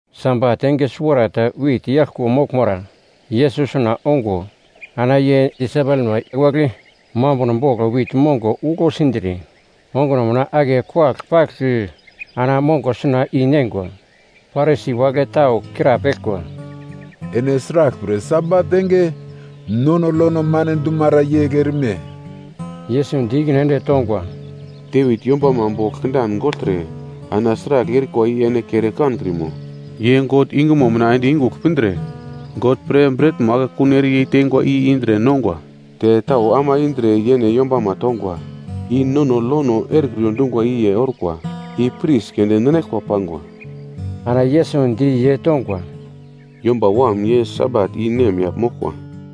Sabat enge suwarata wit yaglko moglmara Yesus suna ongo ana ye disaipelma wagle mambuno bogl wit mongo uglo sindre onguno mina ake kuwagl pagl ana mongo suna i neingwa. Parisi wagle tau krapeglkwa, “Ene sraglpre Sabat enge nono lono mane dumara yegl erime?” Yesus di ikine ende tongwa, “Devit yombama bogl kindan gogltre ana sragl erikwa i ene kere kankrimo? Ye God yungumo mina ende yungugl pindre, God pre bretmo akekun ere yeiteingwa i indre nongwa, te tau ama indre yene yombama tongwa. I nono lono erekriyo dungwa i ye orkwa, i pris keunde ninaglkwa pangwa.” Ana Yesus di ye tongwa, “Yomba Wam ye Sabat i nemyagl moglkwa.”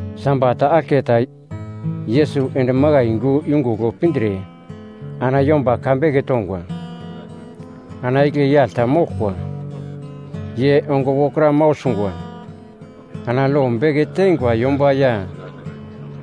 Sabat aglketa Yesus ende makai yungu yungugl pindre ana yomba ka beke tongwa. Ana igle yagl ta moglkwa ye ongo wokra mau sungwa. Ana lo beke teingwa yomba ya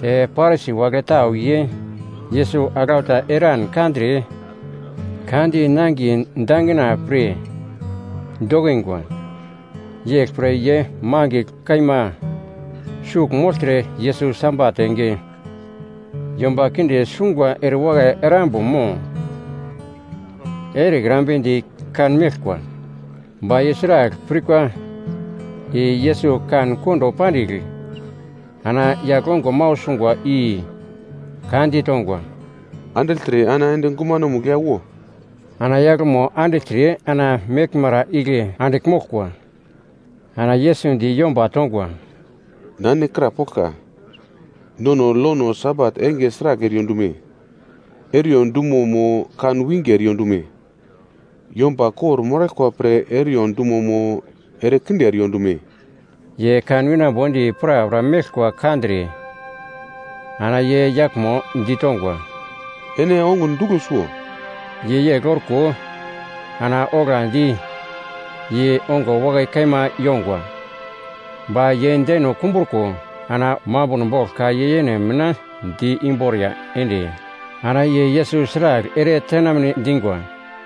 te Parisi wagle tau ye Yesus aglau ta eran kandre ka di nangiye dangina pre dokingwa. Yeglpre ye mangigl kaima sugl mogltre Yesus Sabat enge yomba kinde sungwa erewakai erambo mo erekrambedi kanmeglkwa. Ba ye sragl pirkwa i Yesus kan kondo pandigl ana yagl ongo mau sungwa i ka ditongwa, “Andigltre ana ende gumanomugl ya wo.” Ana yaglmo andigltre ana meglmara igle andigl moglkwa. Ana Yesus di yomba tongwa, “Na ene krapoglka, nono lono Sabat enge sragl eriyo dume? Ere-iyo dumo mo kan winge eriyo dume? Yomba kor-moraglkwa pre ere-iyo dumo mo, ere kinde eriyo dume?” Ye kan winambo di prapra meglkwa kandre ana ye yaglmo ditongwa, “Ene ongun duglo suwo.” Ye yegl orko ana oglandi ye ongo wakai kaima yongwa. Ba ye deno kumbruko ana mambuno bogl ka ye yene mina di imboriya ende ana ye Yesus sragl ere tenamne dingwa.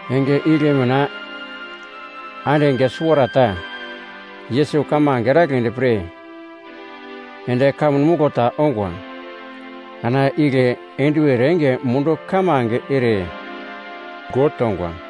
Enge igle mina ande enge suwarata Yesus kamange eragledi pre ende kamun muglo ta ongwa. Ana igle enduwer enge mundu kamange ere God tongwa.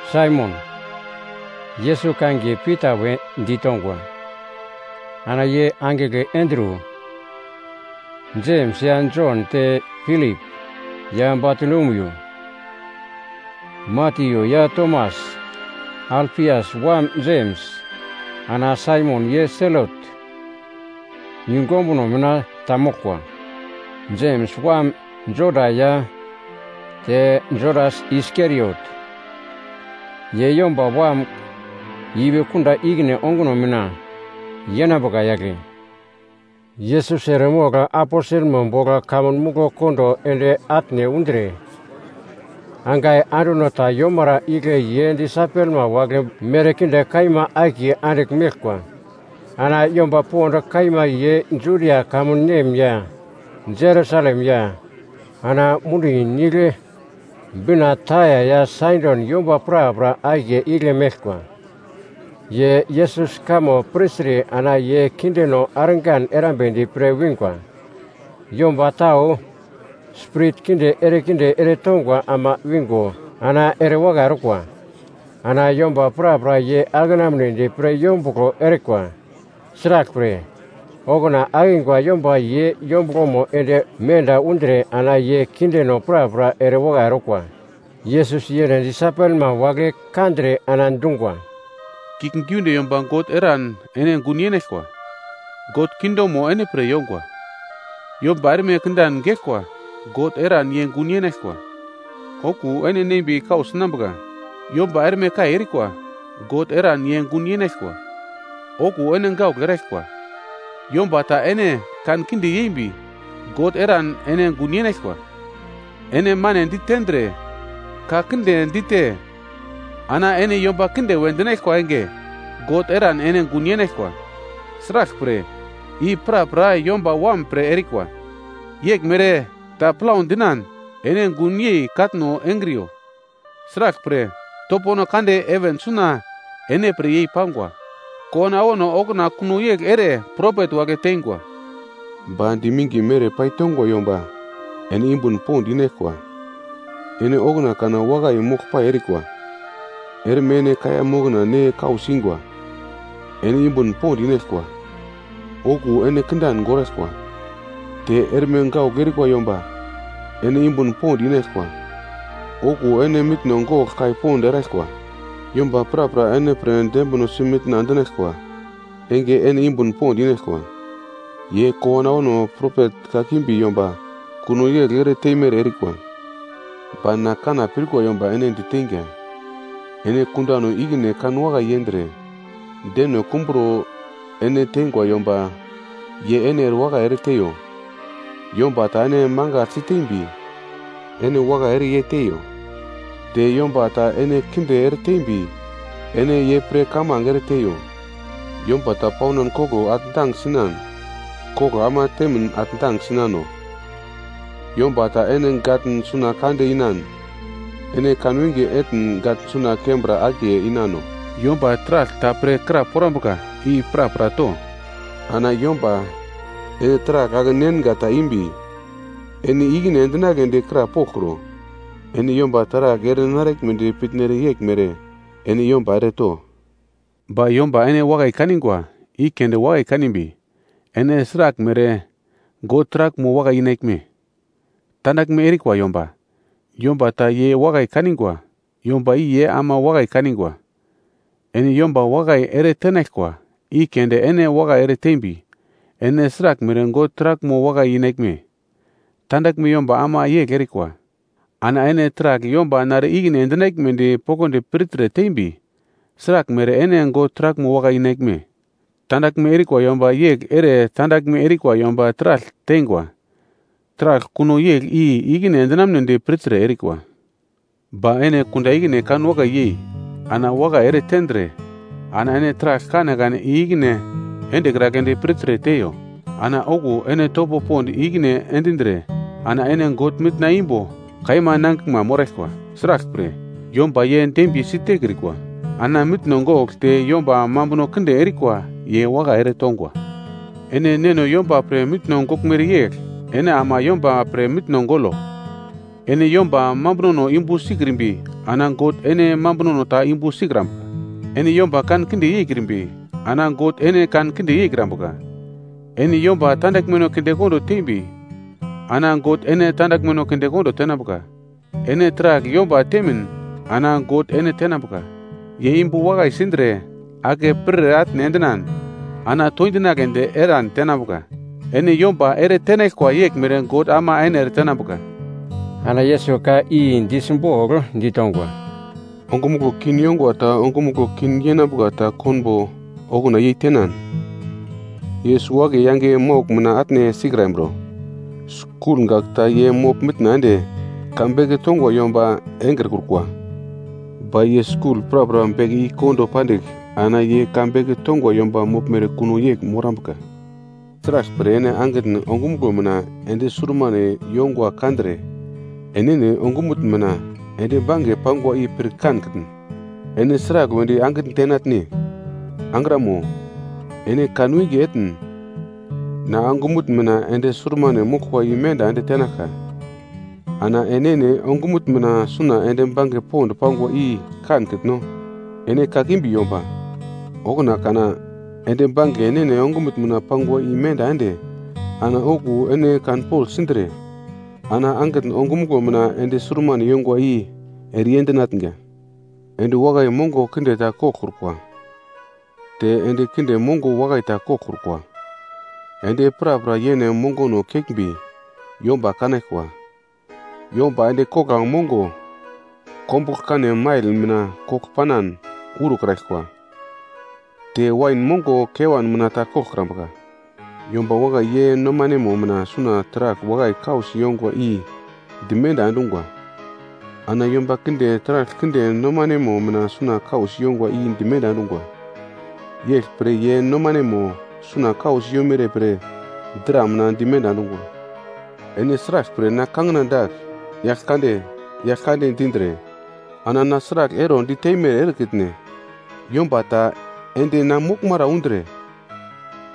Saimon, Yesus kangiye Pita wedi tongwa, ana ye angigle Andru. Jems ya Jon te Pilip ya Batolomiu. Matyu ya Tomas, Alfias wam Jems, ana Saimon ye Selot yungu ombuno mina ta moglkwa. Jems wam Juda ya te Judas Iskariot, ye Yomba Wam ipi kunda ikine onguno mina yenambuka yagle. Yesus eremogl aposelmo bogl kamun muglo kondo ende atne undre, angai anduno ta yomara igle ye disaipelma wagle merkinde kaima akiye andigl meglkwa. Ana yomba pond kaima ye Judia kamun nem ya Jerusalem ya ana mundi nigle bina Taia ya Saidon yomba prapra akiye igle meglkwa. Ye Yesus kamo pirtre ana ye kindeno argan erambedi pre wingwa. Yomba tau spirit kinde erekinde eretongwa ama wingo ana erewakai orkwa. Ana yomba prapra ye akenamunedi pre yombuglo erikwa. Sraglpre, okuna akingwa yomba ye yombuglomo ende menda undre ana ye kindeno prapra erewakai orkwa. Yesus yene disaipelma wagle kandre ana dungwa, “Kiuglgiunde yomba God eran ene gun yenaglkwa, God kingdomo ene pre yongwa. Yomba erme kindan geglkwa God eran ye gun yenaglkwa, okuwo ene nembi kau sinambuka. Yomba erme kai erikwa. God eran ye gun yenaglkwa, okuwo ene gaugl eraglkwa. Yomba ta ene kankinde yeimbi God eran ene gun yenaglkwa, ene mane ditendre ka kinde dite, ana ene yomba kinde we dinaglkwa enge God eran ene gun yenaglkwa. Sraglpre i prapra Yomba Wam pre erikwa. “Yeglmere ta plau dinan ene gunyei katno engriyo. Sraglpre topono kande heven suna ene pre yei-pangwa. Kowano awano okuna kuno yegl ere propet wagle teingwa. “Ba diminge mere paitongwa yomba ene yumbun pond inaglkwa, ene okuna kana wakai moglpai erikwa. Erme ene kaiya mokna ne kau singwa, ene yumbun pond inaglkwa. Okuwo ene kindan goraglkwa. Te erme gaugl erikwa yomba ene yumbun pond inaglkwa, okuwo ene mitno gogl kai pond eraglkwa. Yomba prapra ene pre dembinosi mitna endinaglkwa enge ene yumbun pond inaglkwa, ye kowano awano propet kakimbi yomba kuno yegl ere teimere erikwa. “Ba na kanna pirkwa yomba ene diteinga, ene kundano ikine kan wakai yendre, deno kumbro ene teingwa yomba ye ene erewakai ere teiyo. Yomba ta ene mangaglsi tembi, ene wakai ere ye teiyo. Te yomba ta ene kinde eretembi ene ye pre kamange ere teiyo. Yomba ta paunan koglo atndang sinan, koglo ama temin atndang sinano. Yomba ta ene gatn suna kande inan, ene kanwinge etn gatn suna kembra akiye inano. Yomba taragl ta pre kraporambuka, i prapra to. Ana yomba ene taragl ake-nenga ta imbi, ene i-ikine endinagledi krapoglkro. Ene yomba taragl ere naraglmedi pitnere yeglmere ene yomba ere to. “Ba yomba ene wakai kanigwa, i keunde wakai kanimbi, ene sraglmere God taraglmo wakai inaglme? Tandaglme erikwa yomba, yomba ta ye wakai kanigwa, yomba i ye ama wakai kanigwa. Ene yomba wakai ere tenaglkwa i keunde ene wakai ere tembi, ene sraglmere God taraglmo wakai inaglme, tandaglme yomba ama yegl erikwa! Ana ene taragl yomba nare ikine endinaglmedi poglodi pirtre tembi, sraglmere ene God taraglmo wakai inaglme? Tandaglme erikwa yomba yegl ere tandaglme erikwa yomba taragl teingwa, taragl kuno yegl i-ikine endinamnedi pirtre erikwa. Ba ene kunda ikine kan wakai yei ana wakai ere tendre ana ene taragl kanekane i-ikine endekragledi pirtre teiyo. Ana okuwo ene topo pond i-ikine endindre ana ene God mitna imbo kaima nangiglma moraglkwa. Sraglpre yomba ye dembiye sitekriwa ana mitno gogl te yomba mambuno kinde erikwa ye wakai ere tongwa. Ene Neno yomba pre mitno goglmere yegl ene ama yomba pre mitno golo. “Ene yomba mambunono yumbu sikrimbi ana God ene mambunono ta yumbu sikrambuka. Ene yomba kankinde yeikrimbi ana God ene kankinde yeikrambuka. Ene yomba tandaglmeno kindekondo teimbi ana God ene tandaglmeno kindekondo tenambuka. Ene taragl yomba temin ana God ene tenambuka, ye yumbu wakai sindre ake pirir ere atne endinan ana toindinagledi eran tenambuka. Ene yomba ere tenaglkwa yeglmere God ama ene ere tenambuka.” Ana Yesus ka i di simbogl ditongwa, “Ongumuglo kin yongwa ta ongumuglo kin yenambuka ta konbo okuna yei tenan, ye suwo-akiye yange maugl mina atne sikrambro? Skul gak ta ye mogl-mitna ende ka beke tongwa yomba engrekrukwa, ba ye skul prapra beke i kondo pandigl ana ye ka beke tongwa yomba moglmere kuno yegl morambuka. “Sraglpre ene angitn ongumuglo mina endi surmane yongwa kandre, enene ongumutn mina endi bange pangwa i pir kankitn? Ene sragl wedi angitn tenatne, ‘Angramo, ene kanwinge etn na ongumutn mina endi surmane moglkwa imenda ende tenaglka.’ Ana ene enene ongumutn mina suna endi bange pond pangwa i kankitno? Ene kakimbi yomba, okuna kana endi bange enene ongumutn mina pangwa imenda ende ana okuwo ene kanpogl sindre ana angitn ongumuglo mina endi surmane yongwa i ere i-endinatnga. “Endi wakai mongo kinde ta koglkrukwa, te endi kinde mongo wakai ta koglkrukwa. Endi prapra yene mongono keglmbi yomba kanaglkwa. Yomba endi kogla mongo kombugl-kanemail mina kogl panan urokraglkwa, te wain mongo kewan mina ta koglkrambuka. Yomba wakai ye nomanemo mina suna taragl wakai kausi yongwa i dimenda endungwa, ana yomba kinde taragl kinde nomanemo mina kausi yongwa i dimenda endungwa, yeglpre ye nomanemo suna kausi yomere pre dra mina dimenda endungwa. “Ene sraglpre na kangina dagl, Yaglkande, Yaglkande dindre ana na sragl ero diteimere erekitne? Yomba ta ende na moglmara undre,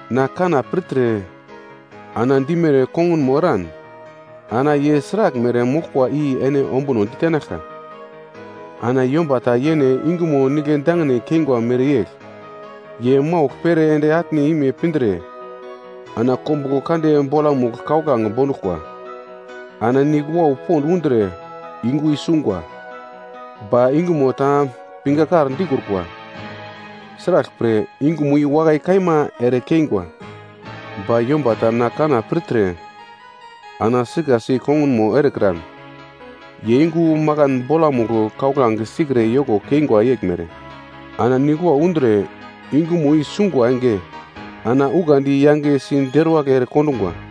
na kanna pirtre ana dimere kongunmo eran, ana ye sraglmere moglkwa i ene ombuno ditenaglka. Ana yomba ta yene yungumo nigle dangine keingwa mereyegl, ye maugl pere ende atne ime pindre ana kombuglo kande bolamugl kauglange bonduglkwa. Ana nigl wau pond undre yungu i sungwa, ba yungumo ta pingakar dikrukwa. Sraglpre yungumo i wakai kaima ere keingwa. Ba yomba ta na kanna pirtre ana sikasi kongunmo erekran, ye yungu makan bolamugl kauglange sikre yoko keingwa yeglmere. Ana nigl wau undre yungumo i sungwa enge ana ukandi yangesi deruwagl ere kondungwa.”